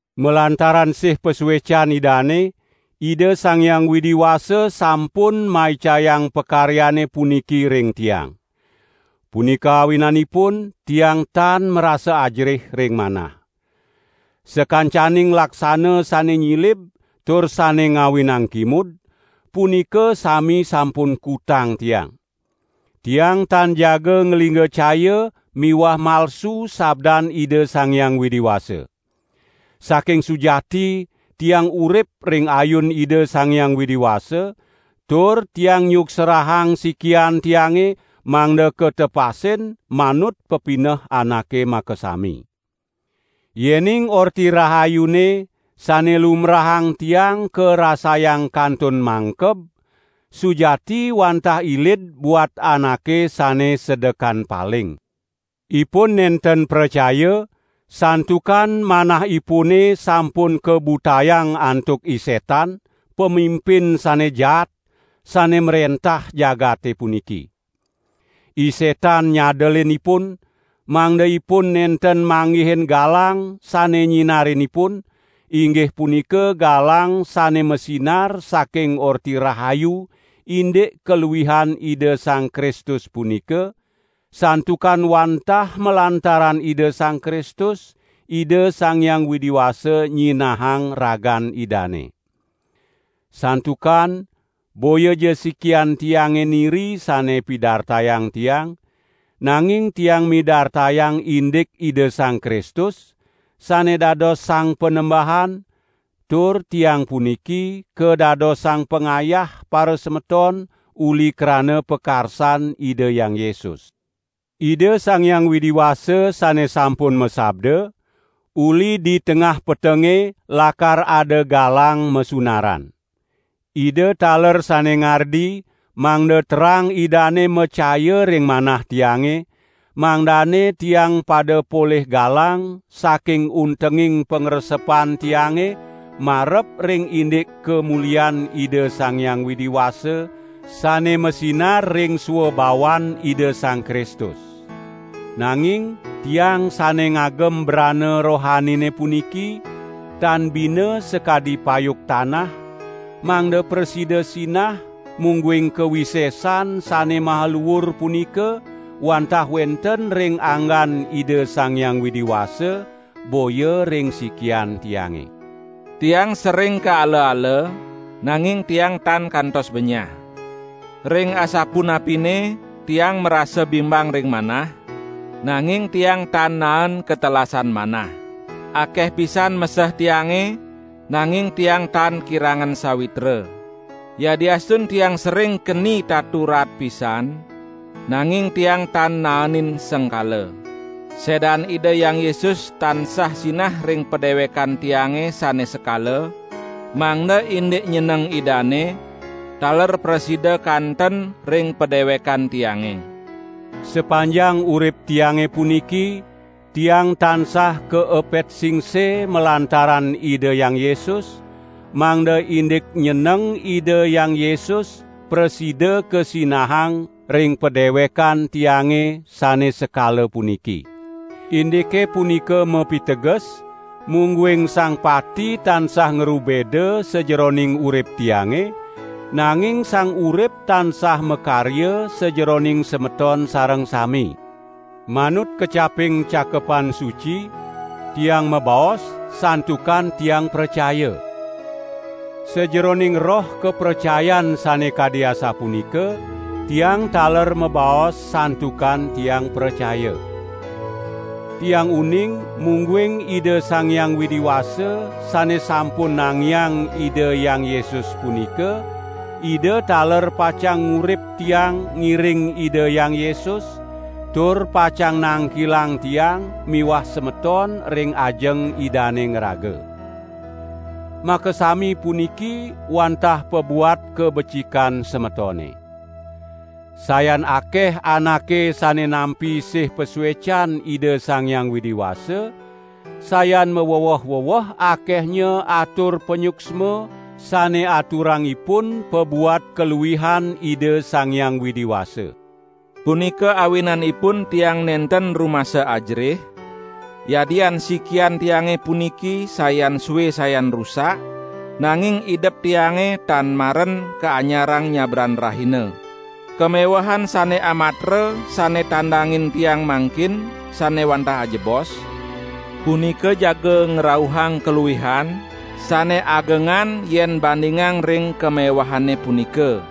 Malantaran sih pasuecan Idane, Ida Sang Hyang Widi Wasa sampun maicayang pakaryane puniki ring tiang. Punika awinanipun tiang tan marasa ajerih ring manah. Sakancaning laksana sane nyilib tur sane ngawinang kimud, punika sami sampun kutang tiang. Tiang tan jaga nglinggacaya miwah malsu sabdan Ida Sang Hyang Widi Wasa. Saking sujati tiang urip ring ayun Ida Sang Hyang Widi Wasa, tur tiang nyuksrahang sikian tiange mangda katepasin manut pepineh anake makasami. Yening Orti Rahayune sane lumbrahang tiang karasayang kantun mangkeb, sujati wantah ilid buat anake sane sedekan paling. Ipun nenten pracaya, santukan manahipune sampun kabutayang antuk I Setan, pamimpin sane jaat, sane mrentah jagate puniki. I Setan nyadelin ipun, mangda ipun nenten manggihin galang sane nyinarin ipun, inggih punika galang sane masinar saking Orti Rahayu indik kaluihan Ida Sang Kristus punika, santukan wantah malantaran Ida Sang Kristus, Ida Sang Hyang Widi Wasa nyinahang ragan Idane. Santukan boyaja sikian tiange niri sane pidartayang tiang, nanging tiang midartayang indik Ida Sang Kristus, sane dados Sang Panembahan, tur tiang puniki, kadadosang pangayah parasemeton uli krana pakarsan Ida Hyang Yesus. Ida Sang Hyang Widi Wasa sane sampun masabda: "Uli di tengah petenge lakar ada galang masunaran." Ida taler sane ngardi, mangda terang Idane macaya ring manah tiange, mangdane tiang pada polih galang saking untenging pangresepan tiange marep ring indik kamulian Ida Sang Hyang Widi Wasa sane masinar ring swabawan Ida Sang Kristus. Nanging tiang sane ngagem brana rohanine puniki, tan bina sakadi payuk tanah, mangda prasida sinah mungguing kawisesan sane maha luur punika wantah wenten ring anggan Ida Sang Hyang Widi Wasa, boya ring sikian tiange. Tiang sering kaala-ala, nanging tiang tan kantos benyah. Ring asapunapine tiang marasa bingbang ring manah, nanging tiang tan naen katelasan manah. Akeh pisan meseh tiange, nanging tiang tan kirangan sawitra. Yadiastun tiang sering keni tatu raat pisan nanging tiang tan naenin sengkala. Sedan Ida Hyang Yesus tansah sinah ring padewekan tiange sane sekala, mangda indik nyeneng Idane taler prasida kanten ring padewekan tiange. Sapanjang urip tiange puniki tiang tansah kaepet singse malantaran Ida Hyang Yesus, mangda indik nyeneng Ida Hyang Yesus prasida kasinahang ring padewekan tiange sane sekala puniki. Indike punika mapiteges, mungguing sang pati tansah ngrubeda sajeroning urip tiange, nanging sang urip tansah makarya sajeroning semeton sareng sami. Manut kecaping Cakepan Suci: "Tiang mabaos, santukan tiang pracaya." Sajeroning roh kapracayan sane kadi asapunika, tiang taler mabaos santukan tiang pracaya. Tiang uning mungguing Ida Sang Hyang Widi Wasa sane sampun nangiang Ida Hyang Yesus punika Ida taler pacang ngurip tiang ngiring Ida Hyang Yesus, tur pacang nangkilang tiang miwah semeton ring ajeng Idane ngraga. Makasami puniki wantah pabuat kabecikan semetone. Sayan akeh anake sane nampi sih pasuecan Ida Sang Hyang Widi Wasa, sayan maweweh-weweh akehnya atur panyuksma sane aturang ipun pabuat kaluihan Ida Sang Hyang Widi Wasa. Punika awinanipun tiang nenten rumasa ajerih, yadian sikian tiange puniki sayan sue sayan rusak, nanging idep tiange tan maren kaanyarang nyabran rahina. Kamewehan sane amatra sane tandangin tiang mangkin sane wantah ajebos, punika jaga ngrauhang kaluihan sane agengan yen bandingang ring kamewehane punika.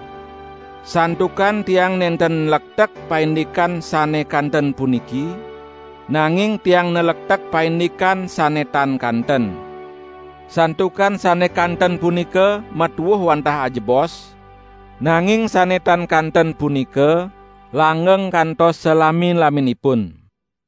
Santukan tiang nenten nlektek paindikan sane kanten puniki, nanging tiang nlektek paindikan sane tan kanten. Santukan sane kanten punika matuuh wantah ajebos, nanging sane tan kanten punika langgeng kantos salami-laminipun.